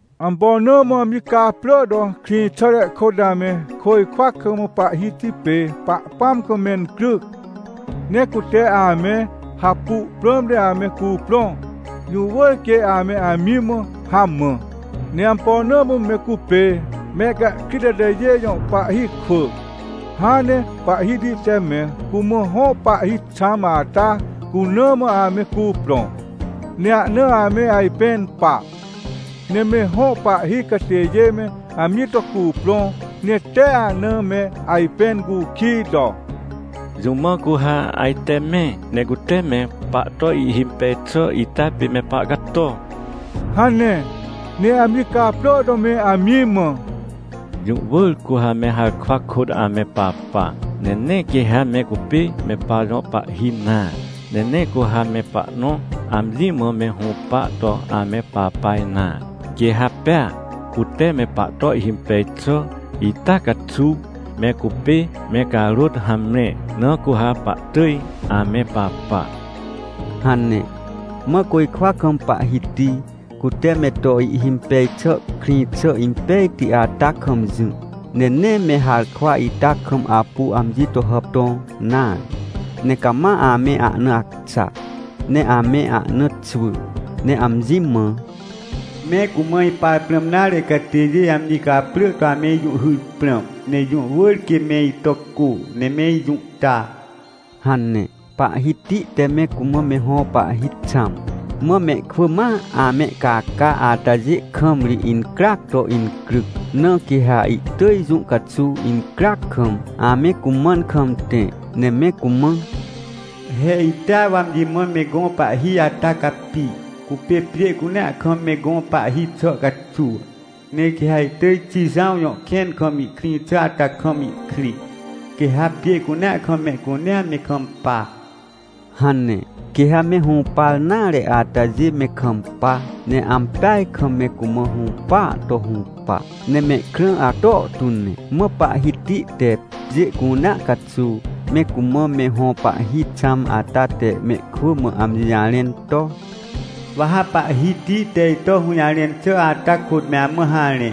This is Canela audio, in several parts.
Ampo na mã amji caprỳ to krĩxàre kôt ame côjkwa kam Pahhiti pê Pahpãm kam mencryc, ne cute ame hapu prãmte ame cuprõ? Jũ wỳr quê ame amji mã hamã. Ne ampo na mã me cupê mehcahkrit atajê jõ pahhi kwỳ, hãn ne Pahhiti te me cumã hõ pahhi xãm ata cuna mã ame cuprõ, ne ahna ame ajpẽn pa? Ne me hõ pahhi catêjê me amji to cuprõ, ne tee ahna me ajpẽn cukij to: “Jũ mã cu ha ajte me, ne cute me pahto ihhimpej xà ita pê me pahcato?” hane. Ne amji caprỳ to me amji mã: “Jũ wỳr cu ha me harkwa kôt ame papa! Ne nee quê ha me cupê me pajõ pahhi nare! Ne nee cu ha me pahnõ amji mã me hũpa to ame papa nare! Quê ha pea cute me pahto ihhimpej xà ita caxuw me cupê me carôt hamre, na cu ha pahtỳj ame papa” hane. Mã côjkwa kam Pahhiti, cute me to ihhimpej xà krĩ xà impejti ata kam jỹ, ne nee me harkwa ita kam apu amji to hàptõ nare, ne cama ame ahna acxa, ne ame ahna xwỳ, ne amji mã: “Me cumã ipar prãm nare catêjê amji caprỳ to ame ijũhhyr prãm, ne jũ wỳr quê me ito cô, ne me ijũhta” hane. Pahhiti te me cumã me hõ pahhi xãm, mã mehkwỳ ma amehcaca atajê kam ri incryac to incryc. Na quê ha ihtỳj jũ caxuw incryac kam, ame cumãn kam tẽ, ne me cumã: “He itea wa amji mã me gõ pahhi ata capi, cupê pjê cunea kam me gõ pahhi xà caxuw! Ne quê ha ihtỳj Xijãw jõ kẽn kam ihkrĩ xà ata kam ihkrĩ, quê ha pjê cunea kam mehcunea me kampa!” hane. Quê ha me hũpar nare atajê me kampa, ne ampeaj kam me cumã hũpaa to hũpa, ne mehkrã acto tu ne. Mã Pahhiti te pjê cunea caxuw, me cumã me hõ pahhi xãm ata te mehkwỳ mã amji jarẽn to: “Wa ha Pahhiti te ito hũjarẽn xà ata kôt me amã harẽ.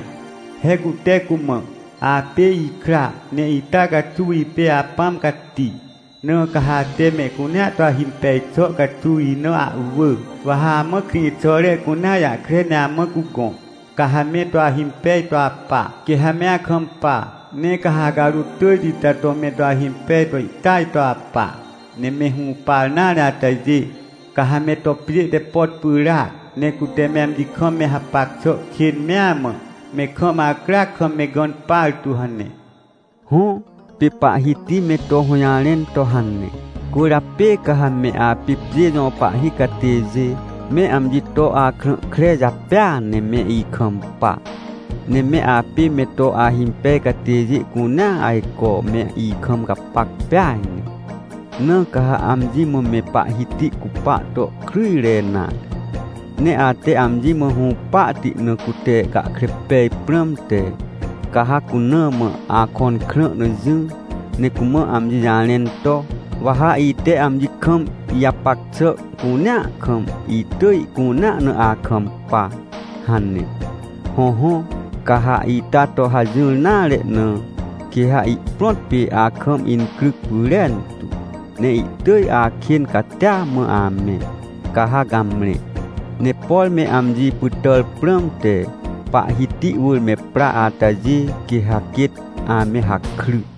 He cute cumã: ‘Apê ikra, ne ita caxuw ipê Apãm Cati. Na ca ha ate mehcunea to ahimpej xà caxuw ina ahwỳ. Wa ha amã krĩxàre cunea jahkre ne amã cugõ, ca ha me to ahimpej to apa, quê ha me akampa. Ne ca ha acarôt tỳjti ita to me to ahimpej to ihtỳaj to apa. Ne me hũpar nare atajê, ca ha me to pjê te pot pyràac, ne cute me amji kam me hapac xà kên mea mã, me kam acryac kam me gãn partu’ hane”. Hõ, pê Pahhiti me to hũjarẽn to hane. Cwỳrjapê ca ha me apê pjê jõ pahhi catêjê, me amji to akrã kre japêa ne me ikampa! Ne me apê me to ahimpej catêjê cunea, ajco me ikam gapac peaj ne! Na ca ha amji mã me Pahhiti cupa to kryjre nare. Ne ate amji mã hũpahti na cute gahkre pej prãmte, ca ha cuna mã akõn krã na jỹ, ne cumã amji jarẽn to: “Wa ha ite amji kam ijapac xà cunea kam, itỳj ihcunea na akampa” hane. Hõhõ, ca ha ita to hajỹr nare na, quê ha ihprõt pê akam incryc pyrentu, ne ihtỳj akên catia mã amẽ, ca ha gamre. Ne por me amji pytàr prãmte, Pahhiti wỳr me pra atajê, quê ha quêt ame hakry.